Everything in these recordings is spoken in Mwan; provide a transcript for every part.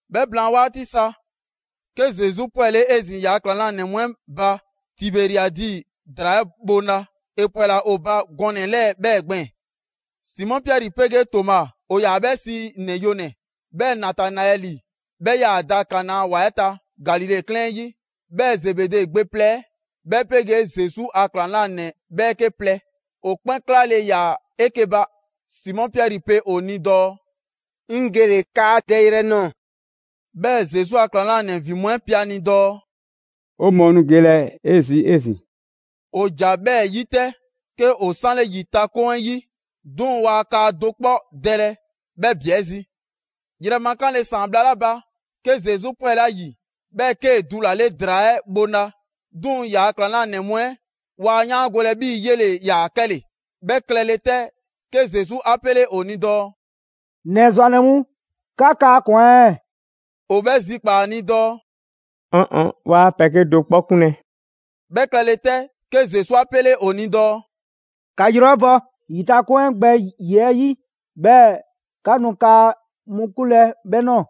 'Bhɛ blaan 'waati sa, 'ke Zesu 'pwɛle 'ezin‑ ‑yaa' ‑klaŋlanɛ mu 'ɛ ba Tiberiadi ‑draa 'ɛ bhoŋla. ‑E ‑pwɛla ‑o ba gɔnɛ‑ 'lɛɛ‑ 'bhɛɛ‑ gbɛɛn‑: Simɔ Piɛri 'pegee Toma (‑o ‑yaa 'bhɛ sii ‑Nɛ Yonɛ‑), 'bhɛɛ‑ Natanaɛli ('bhɛ 'yaa‑ da Kana ‑wa 'ɛ ta, Galile 'klɛɛn 'ɛ 'yi) 'bhɛɛ‑ Zebede gbe plɛ 'ɛ 'bhɛ 'pegee Zesu a ‑klaŋlanɛ 'bhɛɛke plɛ, ‑o 'kpɛn 'klale‑ ‑yaa 'eke‑ ba. Simɔ Piɛri pe ‑o ni dɔɔ: «'Ŋ gele‑ kaa dɛyrɛ‑ nɔɔ‑.» 'Bhɛɛ‑ Zesu a ‑klaŋlanɛ ‑vin mu 'ɛ pe a ni dɔɔ: «'O mɔɔ nu gelɛ 'ezin‑ 'e zi.» ‑O ‑ja 'bhɛɛ‑ 'yi 'tɛ, 'ke ‑o 'sanle ‑yitakoŋ 'ɛ 'yi. 'Duŋ‑ waa kaa do 'kpɔ dɛlɛ 'bhɛ ‑bi 'ɛ zi. Yrɛma 'kanle‑ ‑saan bhla 'la ba, 'ke Zesu 'pwɛle ‑a ‑yi, 'bhɛɛ‑ 'kee‑ dulale ‑draa 'ɛ bhoŋla. 'Duŋ‑ ‑yaa' ‑klaŋlanɛ mu 'ɛ waa 'yaangolɛ 'bhii‑ 'yele‑ ‑yaa 'kɛle‑. 'Bhɛ klɛle 'tɛ, 'ke Zesu 'a 'pele ‑o ni dɔɔ: «‑Nɛ ‑zwannɛ mu, 'ka kaa ꞊kwan ɛɛ?» ‑O 'bhɛ zikpaa ‑a ni dɔɔ: «'Ɔn ɔn, 'waa pɛ 'kedo‑ 'kpɔ 'kunlɛ‑.» 'Bhɛ klɛle 'tɛ, 'ke Zesu 'a 'pele ‑o ni dɔɔ: «‑Ka yrɔ 'ɛ bɔ ‑yitakoŋ 'ɛ gbɛ ‑yiɛ' 'yi, 'bhɛɛ‑ 'ka nu kaa mu 'kunlɛ‑ 'bhɛ ꞊nɔɔ.»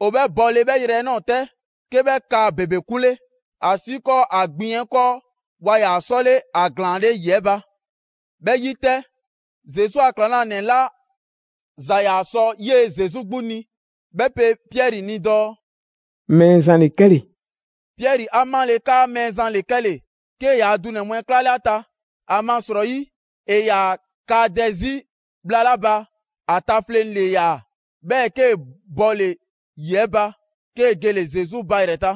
‑O 'bhɛ bɔle 'bhɛ yrɛ 'ɛ ꞊nɔɔ 'tɛ, 'ke 'bhɛ kaa ‑bebe 'kunle, ‑asiikɔɔ ‑a gbiŋ 'ɛ 'kɔɔ, waa ‑yaa 'sɔle ‑a ‑glaanle' ‑yi 'ɛ ba. 'Bhɛ 'yi 'tɛ, Zesu a ‑klaŋlanɛ 'la ‑za ‑yaa sɔ 'yee‑ Zesu 'gbu ni, 'bhɛ pe Piɛri ni dɔɔ: «Mɛɛzan ‑le 'kɛle‑!» Piɛri 'a 'male‑ 'kaa Mɛɛzan ‑le 'kɛle‑, 'kee‑ yaa dunɛ mu 'ɛ 'klale ‑a ta, ‑amasrɔyi ‑e ‑yaa kaa dɛ zii' bhla 'la ba, ‑a tafleŋ‑ ‑le ‑yaa. 'Bhɛɛ‑ 'kee‑ bɔle‑ ‑yi 'ɛ ba, 'kee‑ gele‑ Zesu ba ‑yrɛ ta.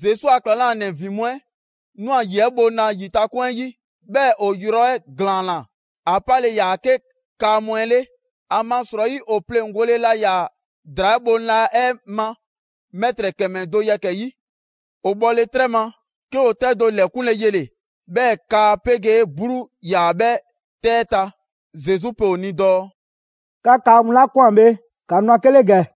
Zesu a ‑klaŋlanɛ ‑vin mu 'ɛ ‑nwa ‑yi 'ɛ bhoŋla ‑yitakoŋ 'ɛ 'yi. 'Bhɛɛ‑ ‑o yrɔ 'ɛ ‑glaanna, ‑a 'pale‑ ‑yaa 'ke kaa mu 'ɛ 'le. ‑Amasrɔyi ‑o pleŋgole laa ‑yaa ‑draa 'ɛ bhoŋla 'ɛ ma mɛtrɛ ‑kɛmɛ do yɛkɛ‑ 'yi. ‑O bhɔle 'trɛ ma, 'ke ‑o 'tɛ do ‑lɛkunle yele‑, 'bhɛɛ‑ kaa 'pegee 'bluu 'yaa‑ 'bhɛ 'tɛ 'ɛ ta. Zesu pe ‑o ni dɔɔ: «'Ka kaa mu 'la ꞊kwan bhe, ‑ka nu 'a 'ke 'le ‑gɛ.»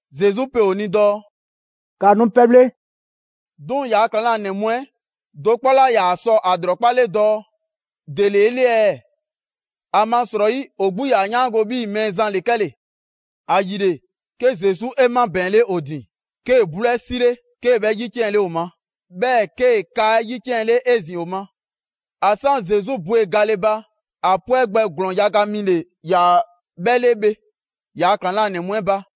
Zesu pe ‑o ni dɔɔ: «‑Ka nu pɛbhle.» 'Duŋ‑ ‑yaa' ‑klaŋlanɛ mu 'ɛ do 'kpɔ 'laa ‑yaa sɔ ‑a ‑lrɔkpale dɔɔ: «‑Dele 'e 'le ɛɛ?» ‑Amasrɔyi ‑o 'gbu 'yaa‑ 'yaango‑ 'bhii‑ Mɛɛzan ‑le 'kɛle‑. ‑Ayile, 'ke Zesu 'e 'mabɛɛnle ‑o ‑din, 'kee‑ 'bluu 'ɛ 'sile, 'kee‑ 'bhɛ 'yiciɛnle ‑o ma. 'Bhɛɛ‑ 'kee‑ 'kaa ‑yiciɛnle 'ezin‑ ‑o ma. ‑A 'san Zesu bwe gale ba, ‑a 'pwɛ gbɛ ‑glɔɔn yaga mi ‑le ‑yaa 'bhɛ 'le bhe ‑yaa' ‑klaŋlanɛ mu 'ɛ ba.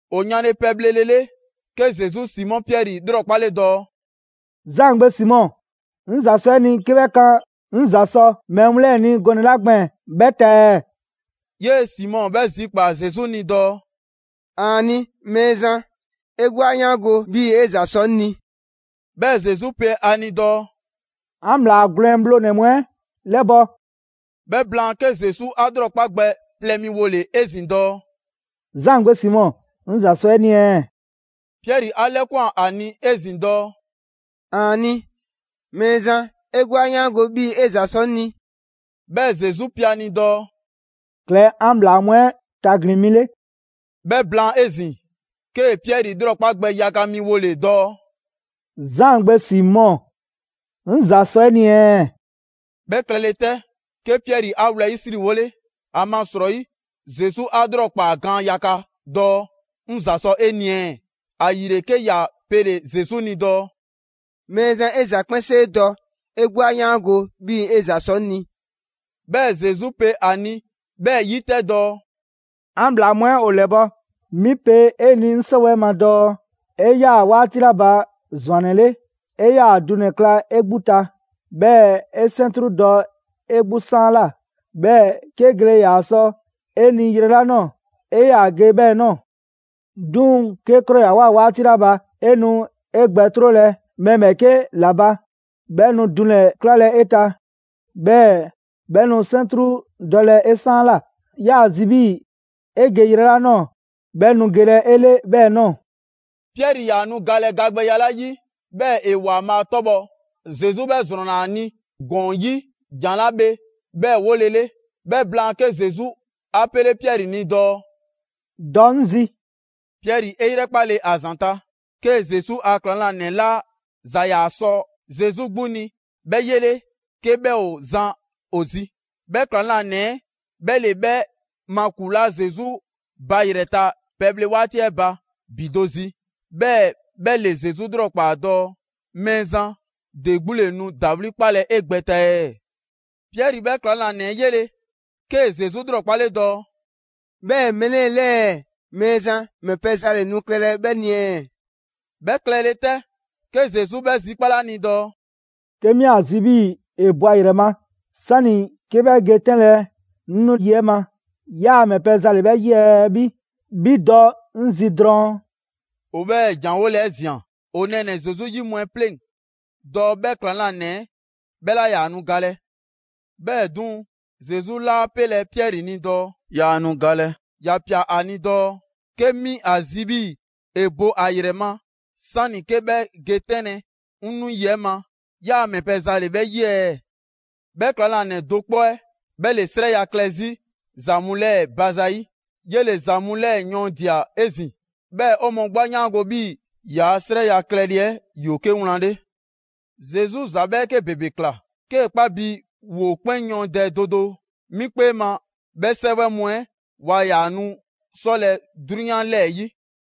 ‑O yanle pɛbhlelele, 'ke Zesu Simɔ Piɛri 'lrɔkpale dɔɔ: «Zaan gbe Simɔ, 'ŋ ‑za sɔ 'e ni 'ke 'bhɛ kan 'ŋ ‑za sɔ mɛɛ mu 'lɛɛ‑ ni gɔnɛ‑ 'la gbɛɛn‑ 'bhɛ ta ɛɛ?» 'Yee‑ Simɔ 'bhɛ zikpaa Zesu ni dɔɔ: «‑Aani' Mɛɛzan, 'e 'gbu 'a 'yaango‑ 'bhii‑ 'e ‑za sɔ 'ŋ ni.» 'Bhɛɛ‑ Zesu pe ‑a ni dɔɔ: «'An ‑bhlaa gwlɛn bhlonɛ‑ mu 'ɛ 'lɛbɔ‑.» 'Bhɛ blaan, 'ke Zesu 'a 'lrɔkpa gbɛ plɛ mi wole‑ 'ezin‑ dɔɔ: «Zaan gbe Simɔ, 'ŋ ‑za sɔ 'e ni ɛɛ?» Piɛri ‑a 'lɛkwan ‑a ni 'ezin‑ dɔɔ: «‑Aani' Mɛɛzan, 'e 'gbu 'a 'yaango‑ 'bhii‑ 'e ‑za sɔ 'ŋ ni.» 'Bhɛɛ‑ Zesu pe ‑a ni dɔɔ: «Klɛ 'an ‑bhlaa mu 'ɛ tagbin mi 'le.» 'Bhɛ blaan 'ezin‑, 'kee‑ Piɛri 'lrɔkpa gbɛ yaga mi wole‑ dɔɔ: «Zaan gbe Simɔ, 'ŋ ‑za sɔ 'e ni ɛɛ?» 'Bhɛ klɛle 'tɛ, 'ke Piɛri 'a wlɛyisriwole, ‑amasrɔyi Zesu 'a 'lrɔkpaa gaan yaga dɔɔ: «'Ŋ ‑za sɔ 'e ni ɛɛ?» ‑Ayile 'ke ‑ya pele‑ Zesu ni dɔɔ: «Mɛɛzan, 'e ‑za 'kpɛnsee dɔ, 'e 'gbu 'a 'yaango‑ 'bhii‑ 'e ‑za sɔ 'ŋ ni!» 'Bhɛɛ‑ Zesu pe ‑a ni 'bhɛɛ‑ 'yi 'tɛ dɔɔ: «'An ‑bhlaa mu 'ɛ ‑o 'lɛbɔ‑. 'Mi pe 'e ni 'ŋ 'sɔwɛɛ ma dɔɔ 'e 'yaa‑ 'waati 'la ba ‑zwannɛ 'le, 'e 'yaa‑ dunɛ‑ kla 'e 'gbu ta, 'bhɛɛ‑ 'e 'sɛntru dɔ 'e 'gbu 'saanla, 'bhɛɛ‑ 'ke gele ‑yaa sɔ 'e ni yrɛ 'la ꞊nɔɔ, 'e 'yaa‑ ge 'bhɛɛ‑ ꞊nɔɔ. 'Duŋ‑ 'kee 'krɔyawoa 'waati 'la ba, 'e nu 'e gbɛ 'trolɛ‑ mɛɛ ‑bhɛɛke' ‑la ba, 'bhɛ nu dunɛ‑ 'klalɛ‑ 'e ta, 'bhɛɛ‑ 'bhɛ nu 'sɛntru dɔlɛ 'e 'saanla꞊. 'Yaa‑ zi 'bhii‑ ‑e ge yrɛ 'la ꞊nɔɔ 'bhɛ nu gelɛ 'e 'le 'bhɛɛ‑ ꞊nɔɔ.» Piɛri ‑yaa nu galɛ gagbɛya 'la 'yi, 'bhɛɛ‑ ‑e ‑Waanbhaa' 'tɔbhɔ‑, Zesu 'bhɛɛ‑ ‑zrɔnna ‑a ni ‑gɔɔn 'yi jan 'la bhe 'bhɛɛ‑ wolele. 'Bhɛ blaan, 'ke Zesu 'a pele Piɛri ni dɔɔ: «Dɔ 'ŋ zi!» Piɛri 'e 'yrɛkpale ‑a ‑zanta', 'kee Zesu a ‑klaŋlanɛ 'la ‑za ‑yaa sɔ Zesu 'gbu ni 'bhɛ 'yele 'ke 'bhɛ ‑o zan ‑o zi. 'Bhɛ ‑klaŋlanɛ 'ɛ 'bhɛ ‑le 'bhɛ makulaa Zesu ba ‑yrɛ ta pɛbhle 'waati 'ɛ ba ‑bi do zi, 'bhɛɛ‑ 'bhɛ ‑le Zesu 'lrɔkpaa‑ dɔɔ: «Mɛɛzan, ‑de 'gbu ‑le nu ‑dawli' 'kpalɛ‑ 'e gbɛ ta ɛɛ?» Piɛri 'bhɛ ‑klaŋlanɛ 'ɛ 'yele‑ 'kee‑ Zesu 'lrɔkpale dɔɔ: «'Bhɛɛ‑ mɛɛ 'lɛɛ‑ 'lɛɛ, Mɛɛzan, ‑mɛ pɛ za ‑le nu klɛlɛ 'bhɛ ni ɛɛ?» 'Bhɛ klɛle 'tɛ, 'ke Zesu 'bhɛ zikpale ‑a ni dɔɔ: «'Ke 'mi ‑a zi 'bhii‑ ‑e bo ‑a ‑yrɛ ma, 'sani‑ 'ke 'bhɛ ge 'tɛnlɛ‑ 'ŋ 'nu 'yi 'ɛ ma, 'yaa‑ ‑mɛ pɛ za ‑le 'bhɛ 'yi ɛɛ? 'Bhi, 'bhi dɔ 'ŋ zi drɔŋ!» ‑O 'bhɛɛ‑ ‑jan 'ɛ 'wole‑ 'ɛ ꞊zian ‑o nɛɛnɛ‑ Zesu 'yi mu 'ɛ 'pleŋ‑ dɔɔ 'bhɛ ‑klaŋlanɛ 'ɛ 'bhɛ 'laa ‑yaa nu galɛ. 'Bhɛɛ‑ 'duŋ‑, Zesu 'laa 'pelɛ‑ Piɛri ni dɔɔ: «Yaa nu galɛ». ‑Ya ꞊pia ‑a ni dɔɔ: «'Ke 'mi ‑a zi 'bhii‑ ‑e bo ‑a ‑yrɛ ma, 'sani‑ 'ke 'bhɛ ge 'tɛnlɛ‑ 'ŋ nu 'yi 'ɛ ma, 'yaa‑ ‑mɛ pɛ za ‑le 'bhɛ 'yi ɛɛ?» 'Bhɛ ‑klaŋlanɛ do 'kpɔ 'ɛ 'bhɛ ‑le 'srɛya‑ klɛ 'zi ‑za mu 'lɛɛ‑ ba zayi'. 'Yele‑ ‑za mu 'lɛɛ‑ yɔɔndia‑ 'ezin‑. 'Bhɛɛ‑ 'o mɔɔ 'gbu 'a 'yaango‑ 'bhii‑ ‑yaa' 'srɛya‑ klɛle 'ɛ ‑yoo 'ke wlan 'le. Zesu ‑za 'bhɛɛke ‑bebe ꞊kla. 'Kee 'kpa bi ‑woo 'kpɛn yɔɔndɛ do do, 'mi 'kpee ma, 'bhɛ 'sɛwɛ mu 'ɛ ‑waa ‑yaa nu 'sɔlɛ‑ 'drunyan 'lɛɛ‑ 'yi.